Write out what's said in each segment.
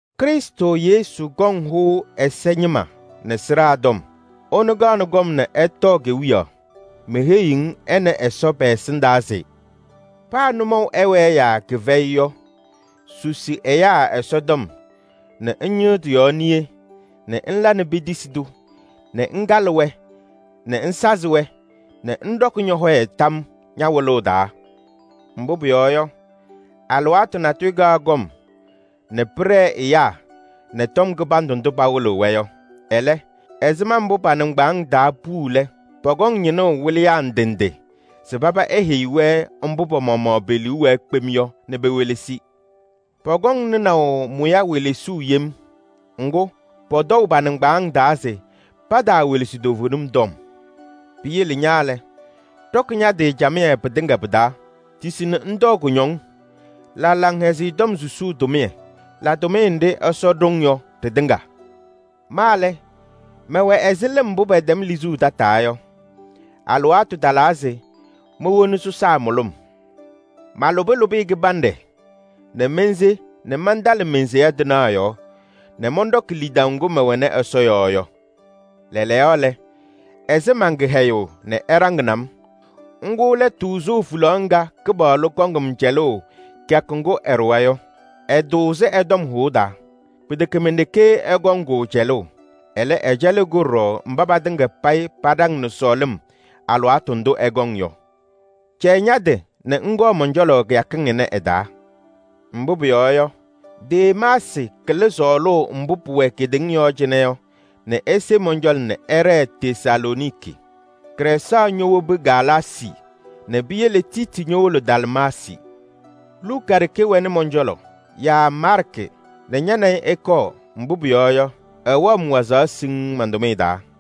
Krɩstʋ Yesu kɔŋ hʋnaʋ ɛza ñɩma nɛ sɩɖaa tɔm. Ɛnʋ kaɣnɩ kɔm nɛ ɛtɔɔ kewiyaɣ. Meheyiɣ-ŋ ɛ nɛ Ɛsɔ pɛ-ɛsɩndaa se: paa nʋmɔʋ ɛwɛɛ yaa kɩfɛyɩ yɔ, susi ɛyaa Ɛsɔtɔm nɛ ŋñɩɣ tɩ-yɔɔ niye nɛ ŋla nɛ petisi-tʋ nɛ ŋkalɩ-wɛ nɛ ŋsazɩ-wɛ nɛ ŋɖɔkɩ ñɔ-hɔyɛ tam ña-wɩlʋʋ taa. Mbʋ pʋyɔɔ yɔ, alɩwaatʋ natʋyʋ kaɣ kɔm nɛ pɩɖɛɛ ɛyaa nɛ tɔm kɩbandʋ ndʋ pawɩlɩɣ-wɛ yɔ. Ɛlɛ, ɛzɩma mbʋ pa-nɩŋgbaaŋ taa puu lɛ, pɔkɔŋ ñɩnʋʋ wɩlɩyaa ndɩ ndɩ se paba eheyi-wɛ mbʋ pa-maɣmaɣ pe-liu wɛɛ kpem yɔ nɛ pewelesi. Pɔkɔŋ nɩnaʋ mʋya welesuu yem. Ŋgʋ, pɔtɔʋ pa-nɩŋgbaaŋ taa se pataawelesi toovenim tɔm. Piyele ña lɛ, ɖɔkɩ ña-tɩ camɩyɛ pɩtɩŋa pɩ-taa. Tisi nɛ ŋtɔɔ kʋñɔŋ, la Laŋhɛzɩyɛ Tɔm susuu tʋmɩyɛ, la tʋmɩyɛ nɖɩ Ɛsɔ ɖʋ-ŋ yɔ ɖɩtɩŋa. Ma lɛ, mɛwɛ ɛzɩ lɩm mbʋ pɛtɛm lizuu tataa yɔ, alɩwaatʋ talaa se mowoni sɔsaa mʋlʋm. Malʋbɩ lʋbɩyɛ kɩbanɖɛ nɛ mense nɛ mantalɩ men-seya tɩnaɣ yɔɔ nɛ mɔnɖɔkɩ lidaʋ ŋgʋ mɛwɛnɩ Ɛsɔ yɔɔ yɔ. Lɛɛlɛɛyɔ lɛ, ɛsɩ man-kɩhɛyʋʋ nɛ ɛɖaŋnɩ-m: ŋgʋ lɛ tʋʋzʋʋ hulaɣ ŋga Kɩpaɣlʋ kɔŋ-m cɛlʋʋ kɩyakʋ ŋgʋ ɛɖʋwa yɔ. Ɛtʋʋzɩ ɛ-tɔm hʋʋ taa. Pɩtɛkɛ men-ɖeke ɛkɔŋ-kʋ cɛlʋʋ, ɛlɛ, ɛcɛlɩɣ-kʋ ɖɔɖɔ mba patɩŋa payɩ paɖaŋnɩ sɔɔlɩm alɩwaatʋ ndʋ ɛkɔŋ yɔ. Cɛyɩ ña-tɩ nɛ ŋkɔɔ mɔn-cɔlɔ kɩyakɩŋ ɩnɛ ɩ-taa. Mbʋ pʋyɔɔ yɔ, Demaasɩ kɩlɩ sɔɔlʋʋ mbʋ pʋwɛ kedeŋa yɔɔ cɩnɛ yɔ nɛ ese mɔn-cɔlɔ nɛ ɛɖɛɛ Tesalooniki. Krɛɛsaɣ ñowobi Galaasii nɛ piyele Tiiti ñowolo Dalmaasii. Mentiyi Ticiiki Efɛɛzɩ. Luka ɖeke wɛnɩ mɔn-cɔlɔ. Yaa Maarkɩ nɛ ña nɛ ɩ ɩkɔɔ, mbʋ pʋyɔɔ yɔ, ɛwɛɣ-m wazaɣ siŋŋ man-tʋmɩyɛ taa.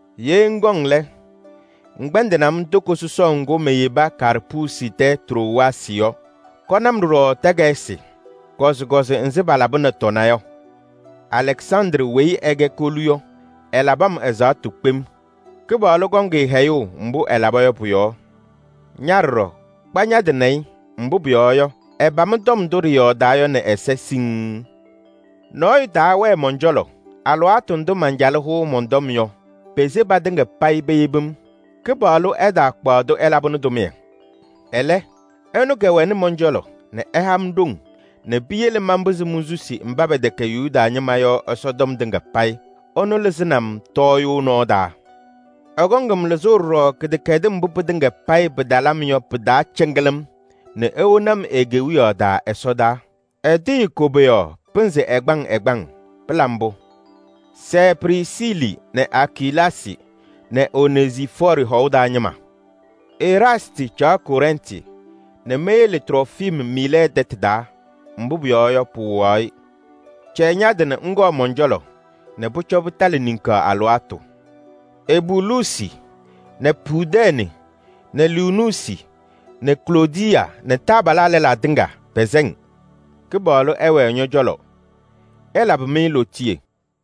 Ye ŋkɔŋ lɛ, ŋkpɛndɩnɩ-m toko sɔsɔʋ ŋgʋ meyebi Karpuusi tɛ Trowaasɩ yɔ. Kɔnɩ-m ɖɔɖɔ takayɩsɩ, kɔzɩkɔzɩ nzɩ palabɩnɩ tɔna yɔ. Alɛksandrɩ weyi ɛkɛ kolu yɔ, ɛlabɩ-m ɛzaɣtʋ kpem. Kɩpaɣlʋ kɔŋ-ɩ hɛyʋʋ mbʋ ɛlaba yɔ pʋ-yɔɔ. Ña ɖɔɖɔ, kpa ña-tɩ nɛ ɩ, mbʋ pʋyɔɔ yɔ, ɛpam tɔm ndʋ ɖɩyɔɔdaa yɔ nɛ ɛza siŋŋ. Nɔɔyʋ taawɛɛ mɔn-cɔlɔ alɩwaatʋ ndʋ mancalɩ hʋʋ mɔn-tɔm yɔ, pese patɩŋa payɩ peyebi-m. Kɩpaɣlʋ ɛtaakpaɣ-tʋ ɛlabɩnɩ tʋmɩyɛ. Ɛlɛ, ɛnʋ kɛwɛnɩ mɔn-cɔlɔ nɛ ɛha-m ɖoŋ nɛ piyele manpɩzɩ monsusi mba pɛtɛkɛ Yuda ñɩma yɔ Ɛsɔtɔm tɩŋa payɩ. Ɛnʋ lɩzɩnɩ-m tɔɔyʋʋ nɔɔ taa. Ɛkɔŋ-m lɩzʋʋ ɖɔɖɔ kɩdɛkɛdɩm mbʋ pɩtɩŋa payɩ pɩtalɩ-m yɔ pɩ-taa cɩŋɩlɩm nɛ ewoni-m e-Kewiyaɣ taa ɛsɔdaa. Ɛtɩɣyɩ koboyaɣ pɩnzɩ ɛgbaŋ ɛgbaŋ! Pɩla mbʋ! Sɛɛ Prisiili nɛ Akilaasɩ nɛ Onezifɔɔrɩ hɔʋ taa ñɩma. Eraastɩ caɣ Kɔrɛntɩ nɛ meyele Trofim Miilɛɛ tɛtʋ taa, mbʋ pʋyɔɔ yɔ, pɩwɩɣaɣ-ɩ. Cɛyɩ ña-tɩ nɛ ŋkɔɔ mɔn-cɔlɔ nɛ pʋcɔ pɩtalɩ niŋkaɣ alɩwaatʋ. Ebuluusi nɛ Pudɛɛnɩ nɛ Liinuusi nɛ Kloodiyaa nɛ taabalaa lɛlaa tɩŋa pɛsɛ-ŋ. Kɩpaɣlʋ ɛwɛɛ ñɔ-cɔlɔ. Ɛlabɩ-mɩ lootiye.